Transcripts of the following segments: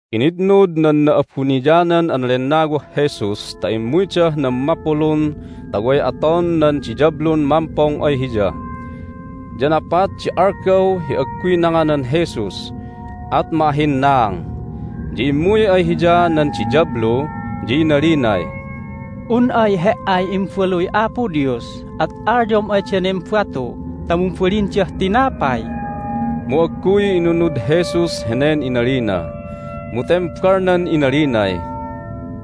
Initnud nan Na'abuniyanan an Lennawah Jesus ta immuydah nan mapulun ta way aton nan diyablun mampong ay Hiya. Ya napat di algaw hi agguy nanganan Jesus, at ma'ahhinnaang. Ya immuy ay Hiya nan diyablu, ya inalinay, "Un ay He"ay Imbaluy Apo Dios at alyom ay danen batu ta mumbalindah tinapay." Mu agguy inunud Jesus henen inalina, mu tembalnan inalinay,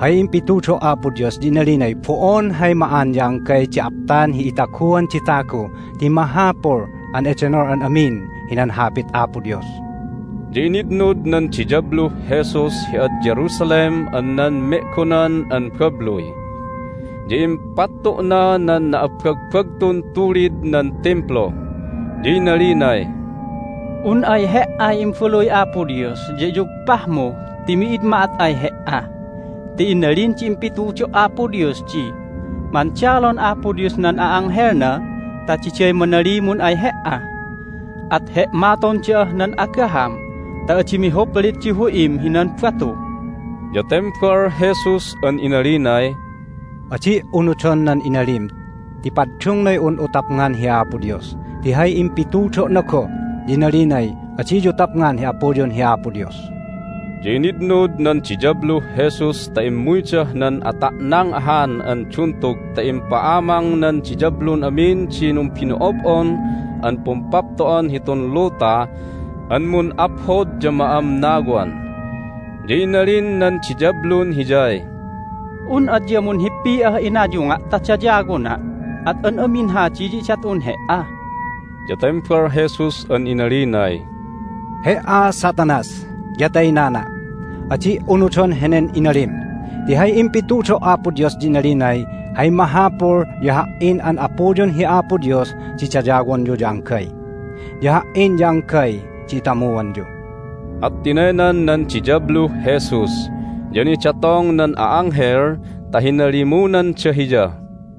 "Hay impitudo' Apo Dios ya inalinay, Bo'on hay ma'an ya anggay di aptan hi itaguan di tagu ti mahapul an edenol hi an amin hinan Hapit Apo Dios." Ya initnud nan diyabluh Jesus hi ad Jerusalem an nan me'gonan an babluy, ya impattu'nah nan na'abbagbagtun tulid nan Timplu, ya inalinay, "Un ay He"ay Imbaluy Apo Dios ya iyugpahmu ti mi'id ma'at ay He"a! Ti inalin di impitudo' Apo Dios di, Mandalon Apo Dios nan a'anghelna ta diday manalimun ay he"a. At he'maton da'ah nan agaham ta adi mihuplit di hu'im hinan batu." Ya tembal Jesus an inalinay, "Adi' unudon nan inalim ti paddungnay un'u tapngan hi Apo Dios. Ti hay impitudo'na goh ya inalinay, Adiyu tapngan hi Apuyun hi Apo Dios." Ya initnud nan diyabluh Jesus ta immuydah nan ata'nang ahan an duntug ta impa'amang nan diyablun amin di numbino'ob'on an pumpapto'an hitun luta an mun'aphod ya ma'amnawan. Ya inalin nan diyablun Hiyay, "Un adya munhippi'ah inayunga' ta dayawona' at an amin hadi ya idat'un He"a." Ya tembal Jesus an inalinay, "He"a, Satanas, ya taynana'! Adi' unudon henen inalim! Ti hay impitudo' Apo Dios ya inalinay, Hay mahapul ya Ha"in an Apuyun hi Apo Dios di dayawonyu ya anggay, ya Ha"in ya anggay di itamuanyu." At tinaynan nan diyabluh Jesus, ya nidatong nan a'anghel ta hinalimunanda Hiya.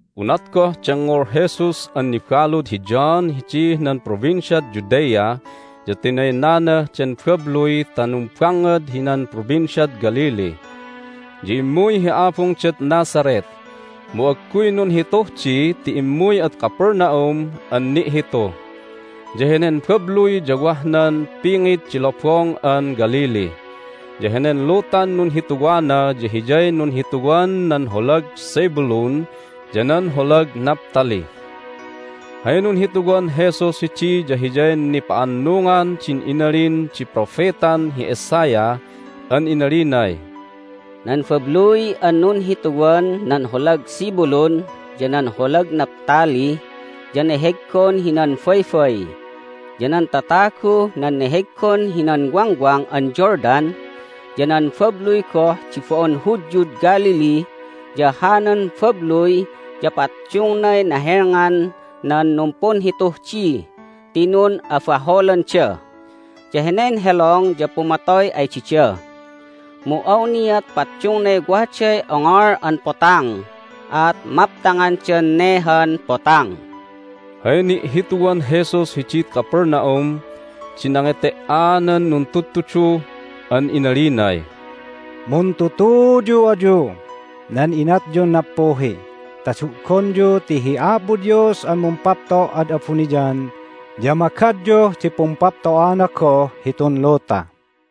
Unat goh dengngol Jesus an nibalud hi John hidih nan Provinciad Judea ya tinaynanah den babluy ta numbangngad hinan Provinciad Galilee. Ya immuy hi abungdad Nazareth, mu agguy nunhituh di ti immuy ad Capernaum an ni'hitu. Ya henen babluy ya wah nan pingit di Lobong an Galilee, ya henen lutan nunhituwana ya hiyay nunhituwan nan holag Zebulun ya nan holag Naphtali. Hay nunhituwan Jesus hidi ya hiyay nipa'annungan din inalin di propetan hi Isaiah an inalinay, "Nan babluy an nunhituwan nan holag Zebulun ya nan holag Naphtali ya neheggon hinan baybay, ya nan tataguh nan neheggon hinan Wangwang an Jordan, ya nan babluy goh di bo'on Hudyud Galilee, ya hanan babluy ya paddungnay nahelngan nan numpunhituh di ti nun'abaholanda, ya henen helong ya pumatoy ay dida. Mu awniat paddungnay waday Ongol an Potang, at maptangandan ne han Potang!" Hay ni'hituwan Jesus hidid Capernaum di nangete"anan nuntudtudu an inalinay, "Muntutuyu ayuh nan inatyun nappuhi ta du'gonyu ti hi Apo Dios an mumpapto' ad abuniyan ya magadyuh di pumpapto'ana goh hitun luta."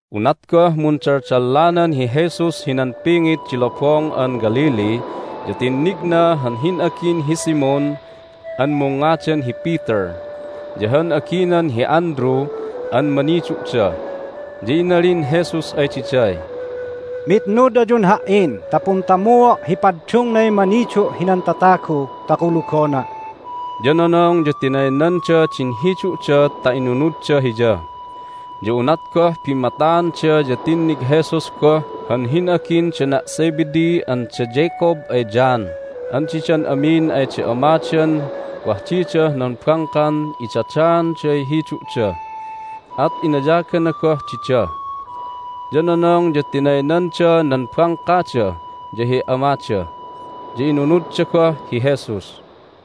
Unat goh mundaldallanan hi Jesus hinan pingit di Lobong an Galilee ya tinnigna han hin'agin hi Simon (an mungngadan hi Peter) ya han aginan hi Andrew an manidu'da. Ya inalin Jesus ay diday, "Mitnud ayun Ha"in ta puntamuo' hi paddungnay manidu' hinan tatagu ta kulugona'." Ya nonong ya tinaynanda din hidu'da ta inunudda Hiya. Ya unat goh bimmataanda ya tinnig Jesus goh han hin'agin dana' Zebedee an da Jacob ay John an didan amin ay da amadan wah didah nan bangkan idadaanday hidu'da. At inayagana goh dida. Ya nonong ya tinaynanda nan bangkada ya hi amada, ya inunudda goh hi Jesus.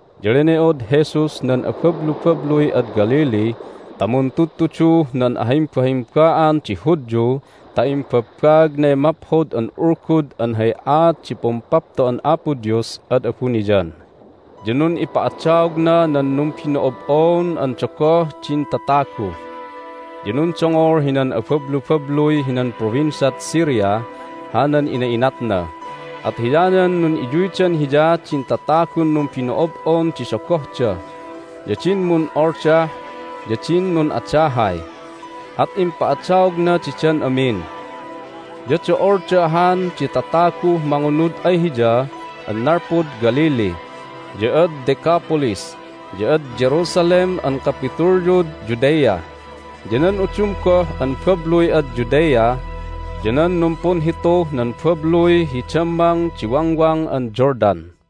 Ya lene'od Jesus nan abablubabluy ad Galilee ta muntudtuduh nan ahimbahimba'an di Hudyu ta imbabbaagnay Maphod an Ulgud an hay aat di Pumpapto'an Apo Dios ad abuniyan, ya nun'ipa'adaogna nan numbino'ob'on an dogoh din tatagu. Ya nundongol hinan abablubabluy hinan Provinciad Syria hanan ina'inatna, at hiyanan nun'iyuydan Hiya din tatagun numbino'ob'on di dogohda, ya din mun'oldah, ya din nun'adahay. At impa'adaogna didan amin. Ya do'olda ahan di tataguh mangunud ay Hiya an nalpud Galilee, ya ad Decapolis, ya ad Jerusalem an kapitulyud Judea, ya nan udum goh an babluy ad Judea, ya nan numpunhituh nan babluy hi dammang di Wangwang an Jordan.